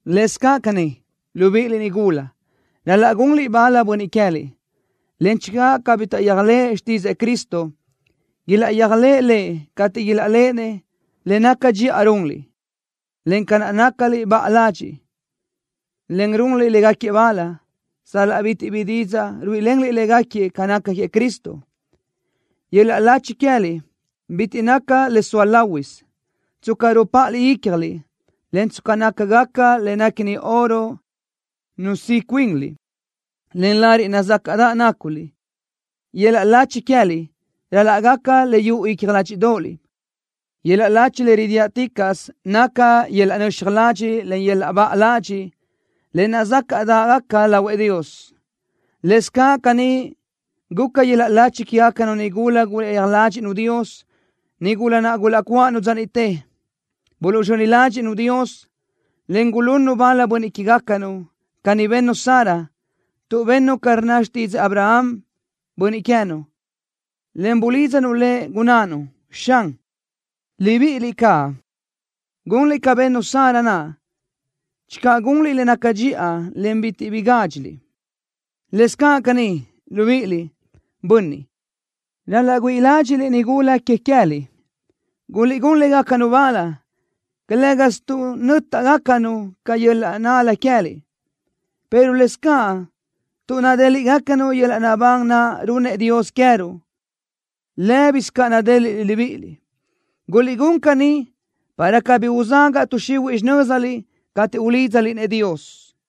Lëscaʼ caní, libíʼiliʼ nigula, ral-laʼ gunliʼ bal bönniʼ que queë́liʼ, en channö cabí taʼyéajlëʼë xtídzëʼë Cristo, ilaʼyéajlëʼë Lëʼ cateʼ ilaʼléʼenëʼ le naca dxiʼa runliʼ, en ca naʼ nácaliʼ baʼa ladxiʼ, en runliʼ légaquiëʼ bal, sal-laʼ bitiʼ bi didzaʼ ruíʼilenliʼ légaquiëʼ ca naca queëʼ Cristo. Yöl-laʼ lachi queë́liʼ bitiʼ naca le zoa láhuisö, tsca rupáʼaliʼ ícjaliʼ, en tsca nácagaca le néquini oro nusíʼ cuinliʼ, en lariʼ nazácaʼdaʼ náculiʼ. Yöl-laʼ lachi queë́liʼ ral-laʼ gaca le yuʼu icja ládxiʼdoʼoliʼ. Yöl-laʼ lachi le ridiáʼticaʼsö naca yöl-laʼ nöxaj ladxiʼ, en yöl-laʼ baʼa ladxiʼ, le nazácaʼdaʼgaca lahuëʼ Dios. Lëscaʼ caní guca yöl-laʼ lachi quégacanu nigula gulaʼyéaj ládxiʼnu Dios, nigula naʼ gulaʼcuáʼanu dza niʼte. Buluʼzxöni ládxiʼnu Dios, en gulunnu bal bönniʼ que queë́gacanu. Caní bennu Sara, tuʼ bennu ca rnna xtídzëʼë Abraham, bönniʼ queë́nu, en bulídzanu lëʼ, gunnánu: “Xan.” Libíʼiliʼ caʼ gunliʼ ca bennu Sara naʼ channö gunliʼ le naca dxiʼa, en bitiʼ bi gádxiliʼ. Lëscaʼ caní, libíʼiliʼ, bönniʼ, ral-laʼ güíʼi ládxiʼliʼ nigula que queë́liʼ. Guliʼgún légacanu bal, calë́gasö tuʼ nö́taʼgacanu ca yöl-laʼ nál-la queë́liʼ, pero lëscaʼ tuʼ nadéliʼgacanu yöl-laʼ naʼbán naʼ runnëʼ Dios queë́ruʼ, lë́bisö ca nadéliʼliʼ libíʼiliʼ. Guliʼgún caní para cabí uzagaʼ tuʼ xihuiʼ xinö́ziliʼ cateʼ ulídzaliʼ-nëʼ Dios.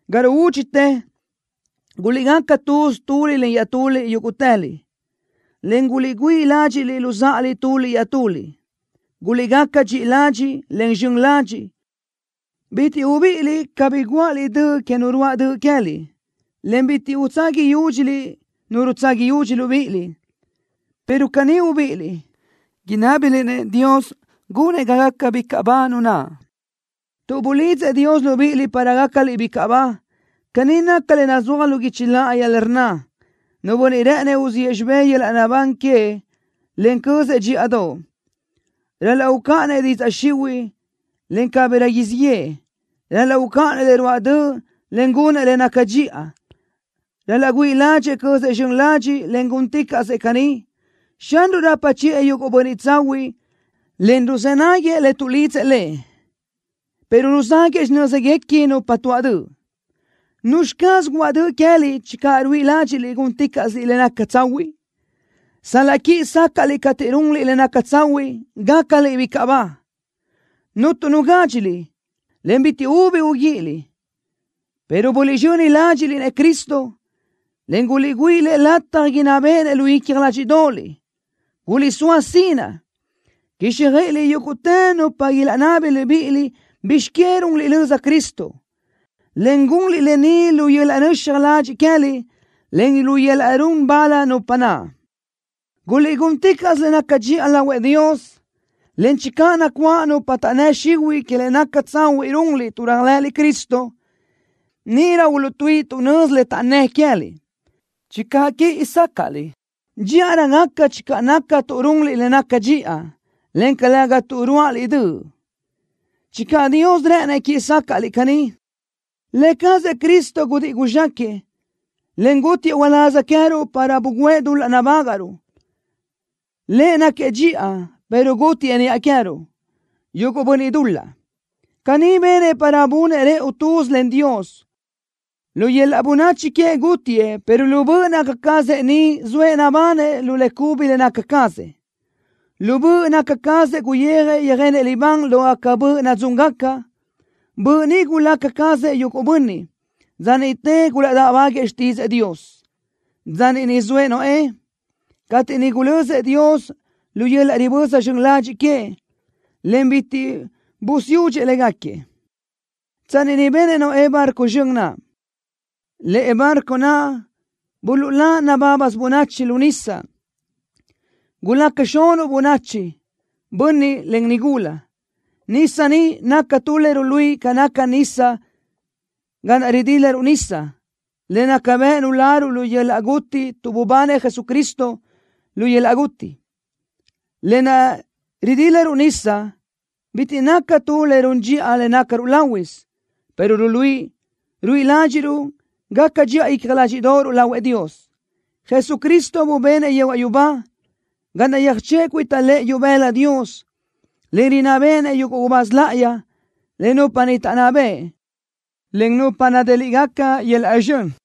Ga ruúdxitë, guliʼgaca tuz tuliʼ len iaʼtuliʼ yúguʼtëliʼ, en guliʼgüíʼ ládxiʼliʼ luzáʼaliʼ tuliʼ iaʼtuliʼ. Guliʼgaca dxiʼi ladxiʼ, en zxön ladxiʼ. Bitiʼ ubíʼiliʼ, cabí guáʼaliʼ döʼ que nu ruáʼ döʼ queë́liʼ, en bitiʼ utsaga yúdxiliʼ nu rutsaga yudxi libíʼiliʼ, pero caní ubíʼiliʼ, inábiliʼ-nëʼ Dios gunëʼ ga gaca bicaʼ ba nu naʼ, tuʼ bulidzëʼ Dios libíʼiliʼ para gácaliʼ bicaʼ ba. Caní naca le nazúaj lu guichi láʼayi le rnna: Nu bönniʼ rë́ʼënëʼ uziʼë xibé yöl-laʼ naʼbán queëʼ, en cözëʼ dxíʼadoʼ, ral-laʼ ucáʼanëʼ didzaʼ xihuiʼ, en cabirö siʼ yëʼë. Ral-laʼ ucáʼanëʼ le ruáʼ döʼ, en gunëʼ le naca dxiʼa. Ral-laʼ güíʼi ládxëʼë cözëʼ zxön ladxiʼ, en gúnticaʼsëʼ caní, Xanruʼ rapa chiʼë yuguʼ bönniʼ tsahuiʼ en ruzë́ náguiëʼ le tuʼlidzëʼ Lëʼ, pero ruzáguëʼë xinö́zguequi nupa tuaʼ döʼ. ¿Nuzxi caz guáʼ döʼ queë́liʼ channö ruíʼi ládxiʼliʼ gúnticaʼsiliʼ le naca tsahuiʼ? Sal-laʼ quíʼi sácaʼliʼ cateʼ runliʼ le naca tsahuiʼ, gácaliʼ bicaʼ ba. Cuntu nu gádxiliʼ, en bitiʼ ubi uguíʼiliʼ pero buliʼzxöni ládxiʼliʼ-nëʼ Cristo, en güíʼiliʼ Lëʼ lataj inná béʼenëʼ lu icja ládxiʼdoʼoliʼ. Guliʼsóa sinaʼ quíxjöiʼiliʼ yúguʼtë nupa ilaʼnabi libíʼiliʼ bizx que runliʼ löza Cristo, en gunliʼ lë ni lu yöl-laʼ nöxaj ladxiʼ queë́liʼ, en lu yöl-laʼ run bal nupa naʼ. Guliʼgúnticaʼsö le naca dxiʼa lahuëʼ Dios, en channö nacuáʼ nupa taʼnnë́ xihuiʼ que le naca tsahuiʼ runliʼ tuʼ réajlëʼëliʼ Cristo, níʼirö uluʼtuíʼi tuʼ nözi le taʼnnë́ queë́liʼ. Channö quíʼi sácaʼliʼ, dxíʼarö gaca channö naca tuʼ runliʼ le naca dxiʼa, en calëga tuʼ ruáʼaliʼ döʼ, channö Dios rë́ʼënëʼ quiʼi sácaʼliʼ caní. Lë cazëʼ Cristo gudíʼi guzxáquëʼë, en gútiëʼ uláz queë́ruʼ para bugǘëʼ dul-laʼ nabágaʼruʼ. Lëʼ náquiëʼ dxiʼa, pero gútiëʼ niʼa queë́ruʼ, yuguʼ bönniʼ dul-laʼ. Caní benëʼ para bunëʼ rëʼu tuz len Dios. Lu yöl-laʼ bönachi queëʼ gútiëʼ pero lu böʼ naca cazëʼ ni zoëʼ nabanëʼ lu le cubi le naca cazëʼ. Lu böʼ naca cazëʼ guyijëʼ yöjenëʼ libán lógaca böʼ nadzúngaca. Böʼ ni gulaca cazëʼ yuguʼ bönniʼ, dza niʼte gulaʼdáʼbaguëʼë xtídzëʼë Dios, dza niʼ zoëʼ Noé, cateʼ niʼ gulözëʼ Dios lu yöl-laʼ riböza zxön ladxiʼ queëʼ, en bitiʼ busiúdxëʼ légaquiëʼ, tsanni niʼ benëʼ Noé barco zxön naʼ. Lëʼe barco naʼ buluʼlá nabábasö bönachi lu nisa. Gulaca xunuʼ bönachi, bönniʼ, en nigula. Nisa niʼ naca tu le ruluíʼi ca naca nisa ga naʼ ridílaruʼ nisa, le naca bëʼ nuláruʼ lu yöl-laʼ guti tuʼ bubanëʼ Jesucristo lu yöl-laʼ guti. Lë naʼ ridílaruʼ nisa bitiʼ naca tu le run dxiʼa le nácaruʼ láhuisö, pero ruluíʼi ruíʼi ládxiʼruʼ gaca dxiʼa icja ládxiʼdoʼoruʼ lahuëʼ Dios. Jesucristo bubenëʼ yehuaʼ yubá, ga naʼ yöjchöʼë cuita lëʼë ibëla Dios, en rinná béʼenëʼ yuguʼ gubáz láʼayi, en nupa niʼ taʼnná bëʼ, en nupa nadéliʼgaca yöl-laʼ zxön.